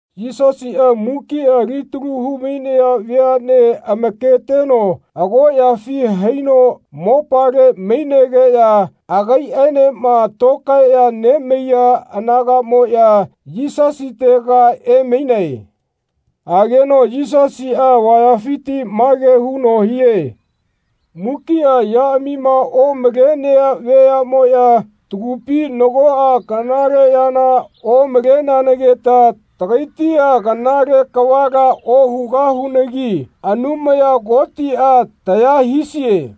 Yisasiꞌa mukiꞌa alitalu hu-mainaya veaꞌnea amaketeno agoꞌyafi haino mopale mainegeꞌya agaiꞌenema tokaeꞌya nemaiya anagaꞌmoꞌya Yisasitega emainae. Ageno Yisasiꞌa avayafiti mage huno hie. Mukiꞌa yaꞌamima omalenea veaꞌmoꞌya “Tagupi nagoꞌa kanale yana omaleanagita tagaitia kanale kavala ohugahunagi Anumaya Kotiꞌa taya hisie.”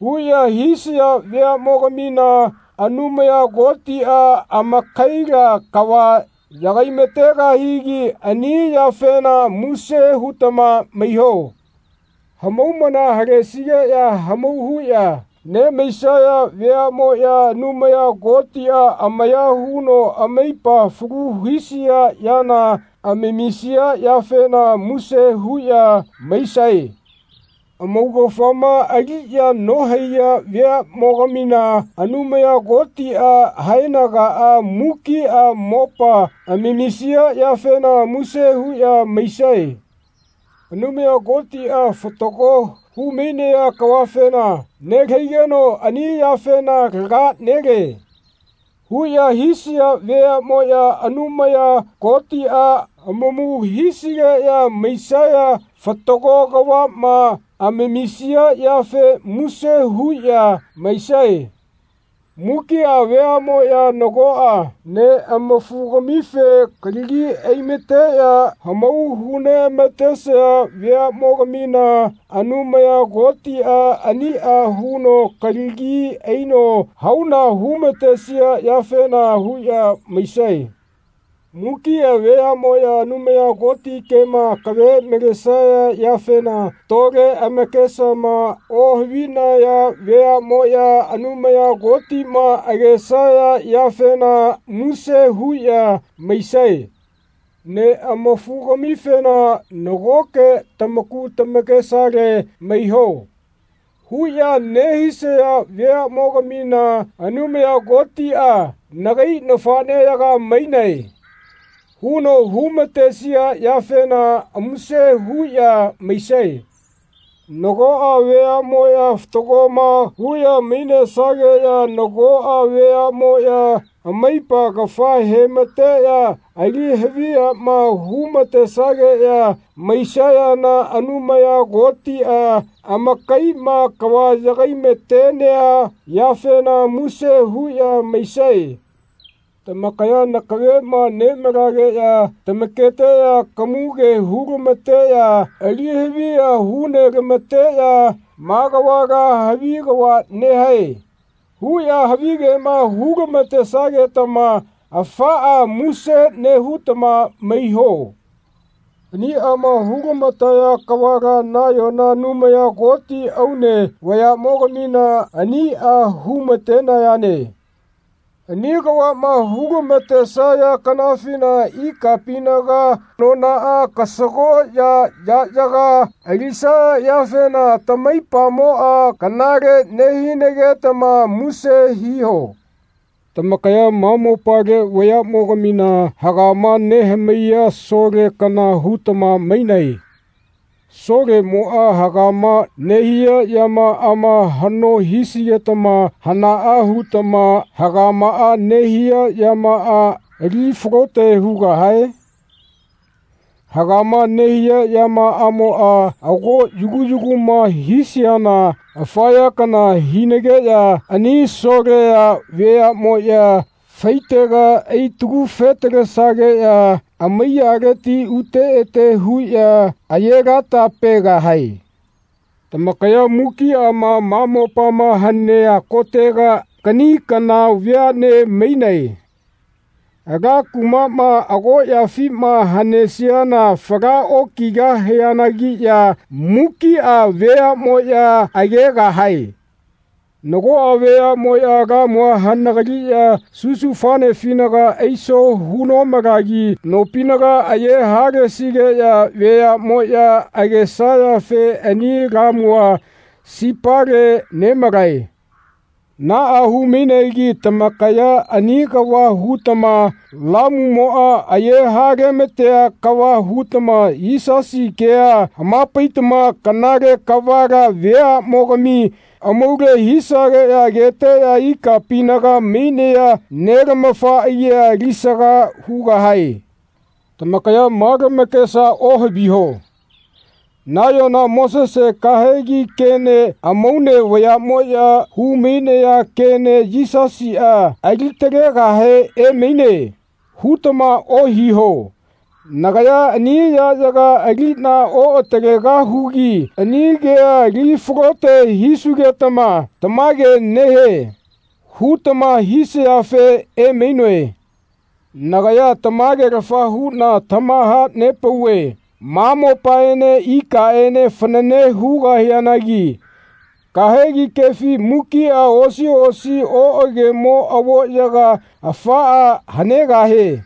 huꞌya hisaya veaꞌmogamina Anumaya Kotiꞌa amakaila kava yagai-ma-tegahigi ani yafena muse hutama maiho. Hamaumana halesigeꞌya hamau huꞌya nemaisaya veaꞌmoꞌya Anumaya Kotiꞌa amaya huno amaipa falu hisia yana amamisia yafena muse huꞌya maisae. Amaugafama aliꞌya nohaiya veaꞌmogamina Anumaya Kotiꞌa haenagaꞌa mukiꞌa mopa amamisia yafena muse huꞌya maisae. Anumaya Kotiꞌa fatago hu-mainea kavafena “Nelahaigeno ani yafena laga nele.” huꞌya hisaya veaꞌmoꞌya Anumaya Kotiꞌa amamu hisigeꞌya maisaya fatago kavaꞌma amamisia yafe muse huꞌya maisae. Mukiꞌa veaꞌmoꞌya nagoꞌa neꞌamafugamife kalagi ai-mateꞌya hamau hu-neꞌamatesaya veaꞌmogamina Anumaya Kotiꞌa aniꞌa huno kalagi aino hauna hu-matesia yafena huꞌya maisae. Mukiꞌa veaꞌmoꞌya Anumaya Koti kema akave malesaya yafena tole amakesama ohavinaya veaꞌmoꞌya Anumaya Kotima agesaya yafena muse huꞌya maisae. Neꞌamafugamifena “Nagoke tamaku tamakesale maiho.” huꞌya nehisaya veaꞌmogamina Anumaya Kotiꞌa “Nagai nafaꞌneyaga mainae.” huno hu-matesia yafena muse huꞌya maisae. Nagoꞌa veaꞌmoꞌya fatagoma huꞌya mainesageꞌya nagoꞌa veaꞌmoꞌya amaipa kafa he-mateꞌya ali-haviyama hu-ma-tesageꞌya maisayana Anumaya Kotiꞌa amakaiꞌma kava yagai-ma-tenea yafena muse huꞌya maisae. Tamakaya nakaveꞌma nemalageꞌya tamaketeꞌya kamuge hu-lama-teꞌya ali-haviya hu-nela-mateꞌya “Ma kavala havi kava nehae.” huꞌya havigema hu-lama-tesagetama afaꞌa muse nehutama maiho. Aniꞌama hu-lama-taya kavala nayona Anumaya Koti amaune vayaꞌmogamina aniꞌa hu-ma-tenayane. Ani kavaꞌma hu-lama-tesaya kanafina ikapinaga anonaꞌa kasagoꞌya yaꞌyaga alisaya yafena tamaipamoꞌa kanale nehinagetama muse hiho. Tamakaya ma mopale veaꞌmogamina hagama nehamaiya sole kana hutama mainae. Solemoꞌa hagama nehia yamaꞌama haꞌno hisigetama hanaꞌa hutama hagama nehia yamaꞌa ali falote hugahae? Hagama nehia yamaꞌamoꞌa ago yagu yaguma hisiana afa ya kana hinageꞌya ani Solea veaꞌmoꞌya faitega ai-tagu-fe-talesageꞌya amaiyaleti ute ete huꞌya aye-lata-pegahae. Tamakaya mukiꞌa ma mopama hanea kotega kaꞌni kana veaꞌne mainae. Ala kumaꞌma agoꞌyafima hanesiana fala okigahianagiꞌya mukiꞌa veaꞌmoꞌya agegahae. Nagoꞌa veaꞌmoꞌya lamua hanagaliꞌya susufanefinaga aiso hu-nomalagi nopinaga aye-halesigeꞌya veaꞌmoꞌya agesayafe ani lamua sipale nemalae. Naꞌa hu-mainegi tamakaya ani kava hutama lamumoꞌa aye-hale-ma-tea kava hutama Yisasi kea hama-paitama kanale kavala veaꞌmogami amaule hisageꞌya ageteꞌya ikapinaga mainea Nelamafa agia alisaga hugahae. Tamakaya ma lamakesa ohaviho “Nayona Mosese kahegi kene amaune vayamoꞌya hu-mainaya kene Yisasiꞌa ali-talegahe emaine.” hutama ohiho. Nagaya ani yaꞌyaga aliꞌna oꞌatalegahugi ani kea ali falote hisugetama “Tamage nehie.” hutama hisayafe emainoe. Nagaya tamagelafa huꞌna tamaha-nepauve ma mopaene ikaꞌene fanane hugaꞌanagi kahegi kefi mukiꞌa osi osi oꞌagemo avoꞌyaga afaꞌa hanegahie.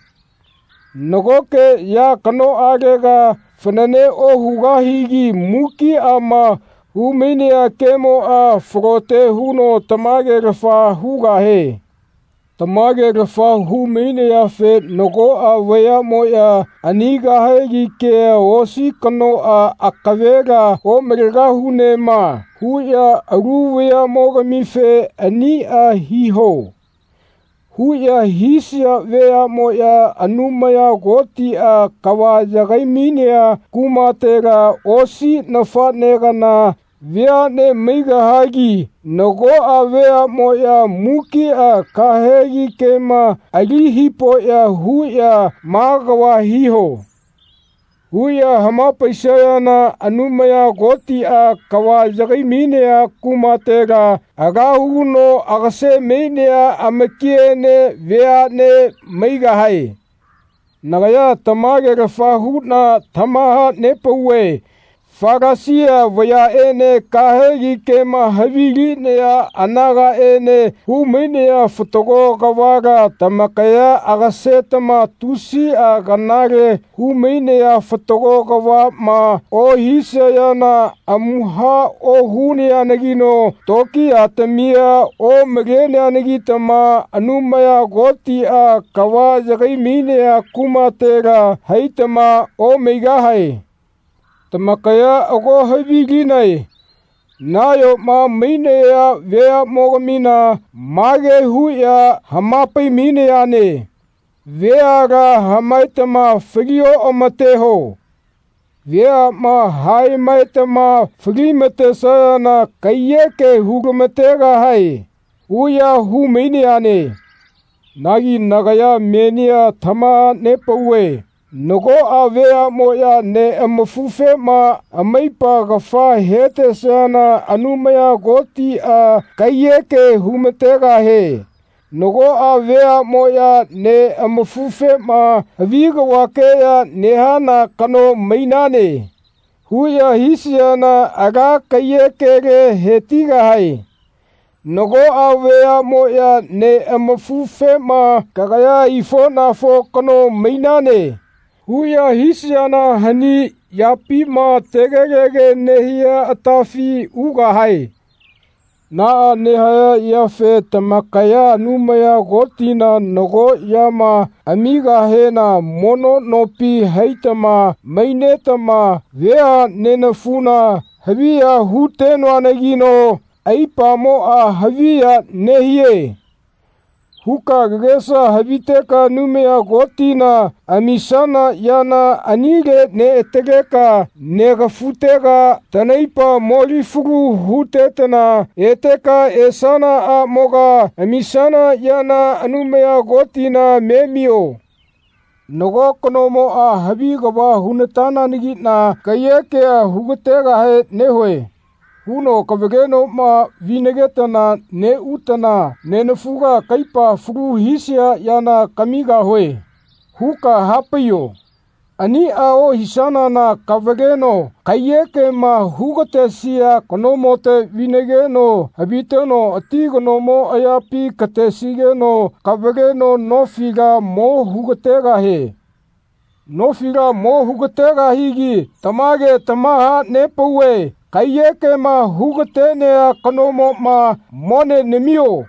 Nagoke ya kanoꞌagela fanane ohugahigi mukiꞌama hu-mainaya kemoꞌa falote huno tamage-lafa hugahie. Tamage-lafa hu-mainayafe nagoꞌa veaꞌmoꞌya ani kahegi kea osi kanoꞌa “Akavela omalegahunema.” huꞌya alu veaꞌmogamife “Aniꞌa hiho.” huꞌya hisaya veaꞌmoꞌya Anumaya Kotiꞌa kava yagai-mainea kumatela osi nafaꞌne kana veaꞌne maigahagi nagoꞌa veaꞌmoꞌya mukiꞌa kahegi kema ali hipoꞌya huꞌya “Ma kava hiho.” huꞌya hama-paisayana Anumaya Kotiꞌa kava yagai-mainea kumatela ala huno agase-mainea amakiene veaꞌne maigahae. Nagaya tamagelafa huꞌna tamaha-nepauve Falasia vayaꞌene kahegi kema havilinaya anagaꞌene hu-mainaya fatago kavala tamakaya agasetama tusiꞌa kanale hu-mainea fatago kavaꞌma ohisayana amuha ohunayanagino tokiyatamia omaleneanagitama Anumaya Kotiꞌa kava yagai-mainea kumatela haitama omaigahae. Tamakaya ago havilinae nayoma mainaya veaꞌmogamina mage huꞌya hama-pai-mainayane “Veala hamaetama fali-oꞌamateho. Veaꞌma haemaetama fali-matesayana kaiyeke hu-lama-tegahae.” huꞌya hu-mainayane. Nagi nagaya menia tamaha-nepauve nagoꞌa veaꞌmoꞌya neꞌamafufema amaipa kafa hetesayana Anumaya Kotiꞌa kaiyeke hu-ma-tegahie. Nagoꞌa veaꞌmoꞌya neꞌamafufema “Havi kavakeꞌya nehana kano mainane.” huꞌya hisayana ala kaiyekele he-tigahae. Nagoꞌa veaꞌmoꞌya neꞌamafufema “Kagaya aifoꞌnafo kano mainane.” huꞌya hisayana hani yapima tegelege nehia atafi ugahae. Naꞌa nehaya yafe tamakaya Anumaya Kotina nago yama amigahena mono nopi haitama mainetama “Veha nenafuna haviya hu-tenoanagino aipamoꞌa haviya nehie.” huka kagesa haviteka Anumaya Kotina amisana yana anile neꞌataleka negafutega tanaipa mo-li-falu hutetana eteka esanaꞌamoga amisana yana Anumaya Kotina memio. Nago kanomoꞌa “Havi kava huna-tananagiꞌna kaiyekea hu-gategahe nehue.” huno kavalenoꞌma vinagetana neꞌutana “Nenafuga kaipa falu hisia yana kamigahue.” huka hapaiyo. Aniꞌa ohisanana kavaleno kaiyekema hu-gatesia kanomote vinageno haviteno ati kanomo ayapi katesigeno kavaleno nofila mo hu-gategahie. Nofila mo hu-gategahigi tamage tamaha-nepauve kaiyekema hu-gatenea kanomoꞌma “Mone namio.”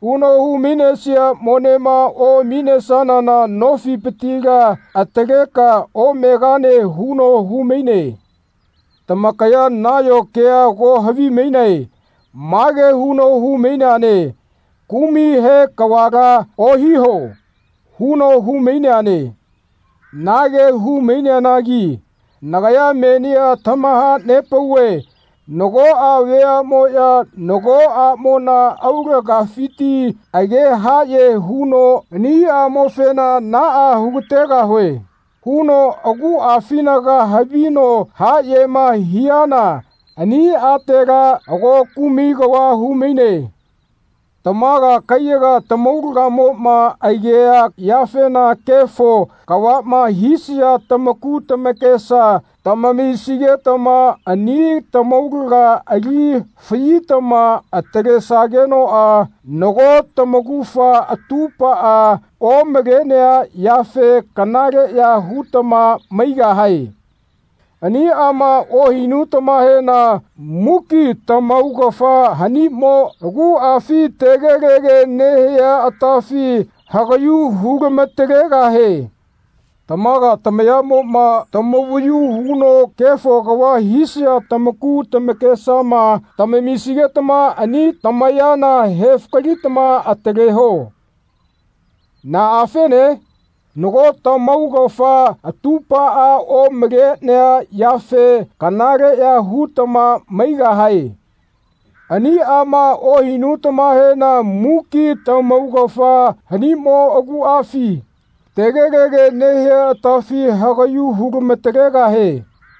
huno hu-mainesia monema oꞌaminesanana nofipitila ataleka omegane huno hu-maine. Tamakaya nayo kea ago havimainae mage huno hu-maineane “Kumai he kavala ohiho.” huno hu-maineane. Nage hu-maineanagi nagaya menia tamaha-nepauve nagoꞌa veaꞌmoꞌya nago aꞌmona aulagafiti age haꞌye huno “Ani aꞌmofena naꞌa hu-ga-tegahue.” huno aguꞌafinaga havino haꞌyema hiana ani atela ago kumai kava hu-maine. Tamaga kaiyaga tamaulagamoꞌma agea yafema kefo kavaꞌma hisaya tamaku tamakesa tamamisigetama ani tamaulaga ali faꞌyitama atalesagenoꞌa nago tamaugafa atupaꞌa omalenea yafe kanaleꞌya hutama maigahae. Aniꞌama ohinutamahena muki tamaugafa hanimo aguꞌafi tegelege nehia atafi hagaꞌyu hu-lama-talegahie. Tamaga tamayaꞌmoꞌma tamavayu huno kefo kava hisaya tamaku tamakesama tamamisigetama ani tamayana he-fakalitama ataleho. Naꞌafene? Nago tamaugafa atupaꞌa omalenea yafe kanaleꞌya hutama maigahae. Aniꞌama ohinutamahena muki tamaugafa hanimo aguꞌafi tegelege nehia atafi hagaꞌyu hu-lama-talegahie.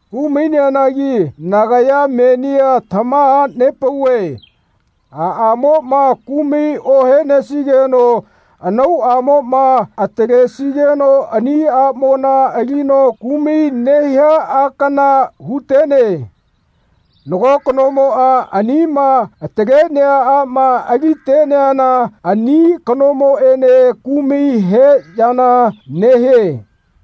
Hu-maineanagi nagaya menia tamaha-nepauve aꞌamoꞌma kumai ohenesigeno anauꞌamoꞌma atalesigeno ani aꞌmona alino kumai nehia a kana hu-tene. Nago kanomoꞌa anima atalenea aꞌma aliteana ani kanomoꞌene kumai he yana nehie.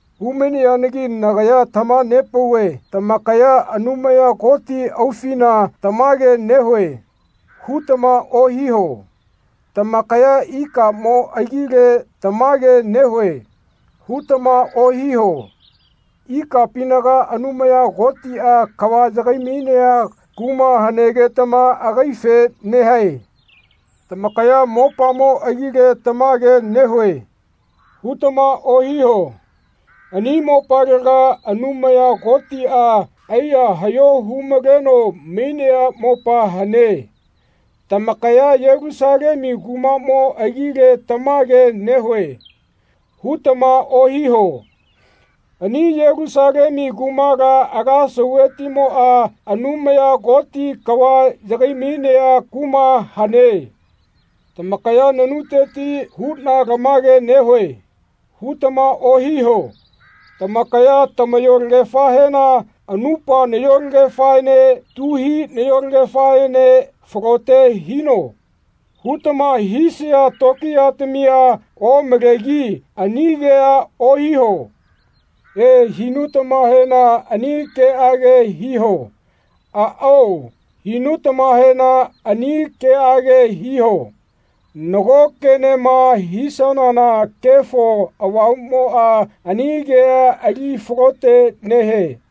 Hu-maineanagi nagaya tamaha-nepauve tamakaya “Anumaya Koti aufina tamage nehue.” hutama ohiho. Tamakaya “Ikamo agile tamage nehue.” hutama ohiho. Ikapinaga Anumaya Kotiꞌa kava yagai-mainea kuma hanegetama agaife nehae. Tamakaya “Mopamo agile tamage nehue.” hutama ohiho. Ani mopalega Anumaya Kotiꞌa aiya haꞌyo hu-maleno mainea mopa hane. Tamakaya “Yelusalemu kumaꞌmo agle tamage nehue.” hutama ohiho. Ani Yelusalemu kumala ala sauvetimoꞌa Anumaya Koti kava yagai-mainea kuma hane. Tamakaya “Nanuteti huꞌna lamage nehue.” hutama ohiho. Tamakaya tamayolagefahena “Anupa nayolegefaene tuhi nayolegefaene falote hino.” hutama hisaya tokiyatamia omalegi ani kea ohiho. “E,” hinutamahena ani keꞌage hiho. “Aꞌao.” hinutamahena ani keꞌage hiho. Nago kenema hisayana Kefo Avamuꞌmoꞌa ani kea ali falote nehie.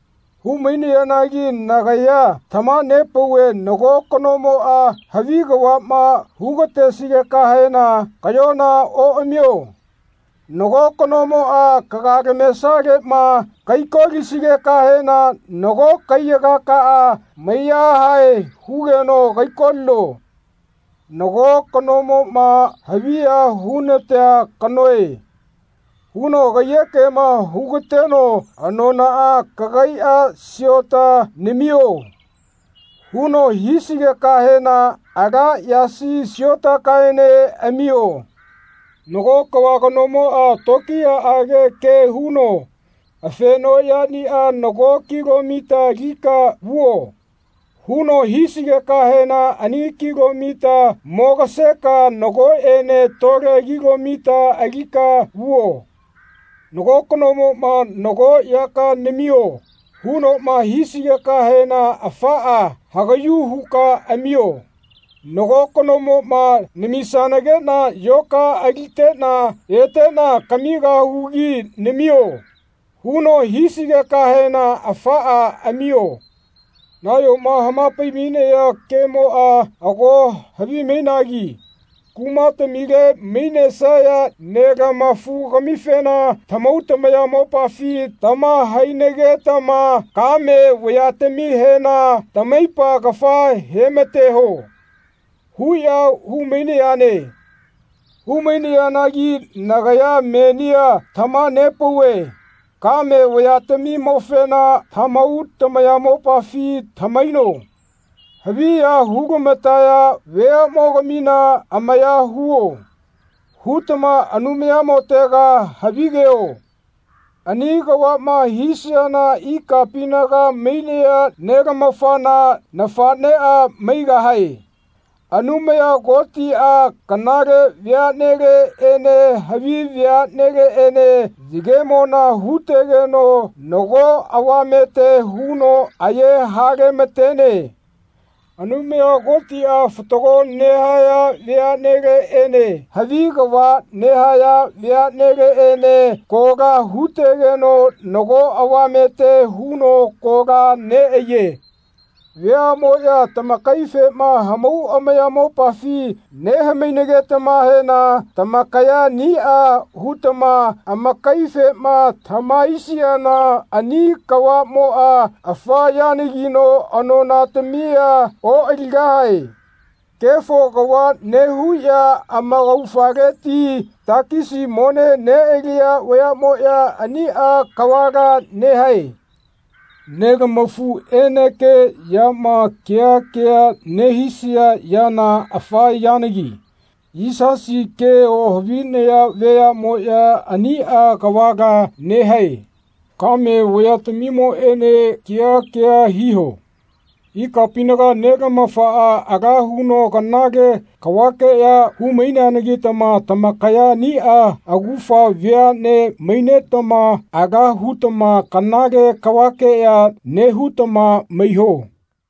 Hu-maineanagi nagaya tamaha-nepauve nago kanomoꞌa havi kavaꞌma hu-ga-tesigekahena kaꞌyona oꞌamio. Nago kanomoꞌa kagalamesaleꞌma kaiko-lisigekahena nago kaiyagakaꞌa mai-yahae hugeno kaiko-lino. Nago kanomoꞌma “Haviya hu-natea kanoe.” huno kaiyekema hu-gateno “Anonaꞌa kagaiꞌa siota namio.” huno hisigekahena ala yasi siotakaene amio. Nago kava kanomoꞌa tokiyaꞌage ke huno “Afenoꞌyaniꞌa nago kilomita alika vuo.” huno hisigekahena ani kilomita mogaseka nagoꞌene tole kilomita alika vuo. Nago kanomoꞌma “Nago yaka namio.” hunoꞌma hisigekahena afaꞌa hagaꞌyu huka amio. Nago kanomoꞌma “Namisanageꞌna yoka aliteꞌna eteꞌna kamigahugi namio.” huno hisigekahena afaꞌa amio. Nayoma hama-pai-mainaya kemoꞌa ago havimainagi “Kumatamile mainesaya nelama-fugamifena tamahau tamayamopafi tamahainagetama kame vayatamihena tamaipa kafa he-mateho.” huꞌya hu-mainayane. Hu-mainayanagi nagaya menia tamaha-nepauve “Kame veatamimofena tamahau tamayamopafi tamahaino. Haviya hu-nelamataya veaꞌmogamina ‘Amaya huo.’ hutama Anumayamotega havigo.” Ani kavaꞌma hisayana ikapinaga mainea Nelamafana nafaꞌneꞌa maigahae. Anumaya Kotiꞌa kanale veaꞌneleꞌene havi veaꞌneleꞌene yagemona hu-tegeno nago avamete huno aye-hale-matene. Anumaya Kotiꞌa fatago nehaya veaꞌneleꞌene havi kava nehaya veaꞌneleꞌene kola hu-tegeno nago avamete huno kola neꞌaiye. Veaꞌmoꞌya tamakaifema hamau amayamopafi neha-mainagetamahena tamakaya aniꞌa hutama amakaifema tamahaisiana ani kavamoꞌa afa yanagino anonatamia oꞌaligahae. Kefo kava nehuꞌya amaugafaleti takisi mone neꞌaliya vayaꞌmoꞌya aniꞌa kavala nehae. Nelamafuꞌenekeꞌyama kea kea nehisaya yana afa yanagi. Yisasi ke ohavinaya veaꞌmoꞌya aniꞌa kavala nehae. Kame vayatamimoꞌene kea kea hiho. Ikapinaga Nelamafaꞌa ala huno kanale kavakeꞌya hu-maineanagitama tamakaya aniꞌa augafa veaꞌne mainetama ala hutama kanale kavakeꞌya nehutama maiho.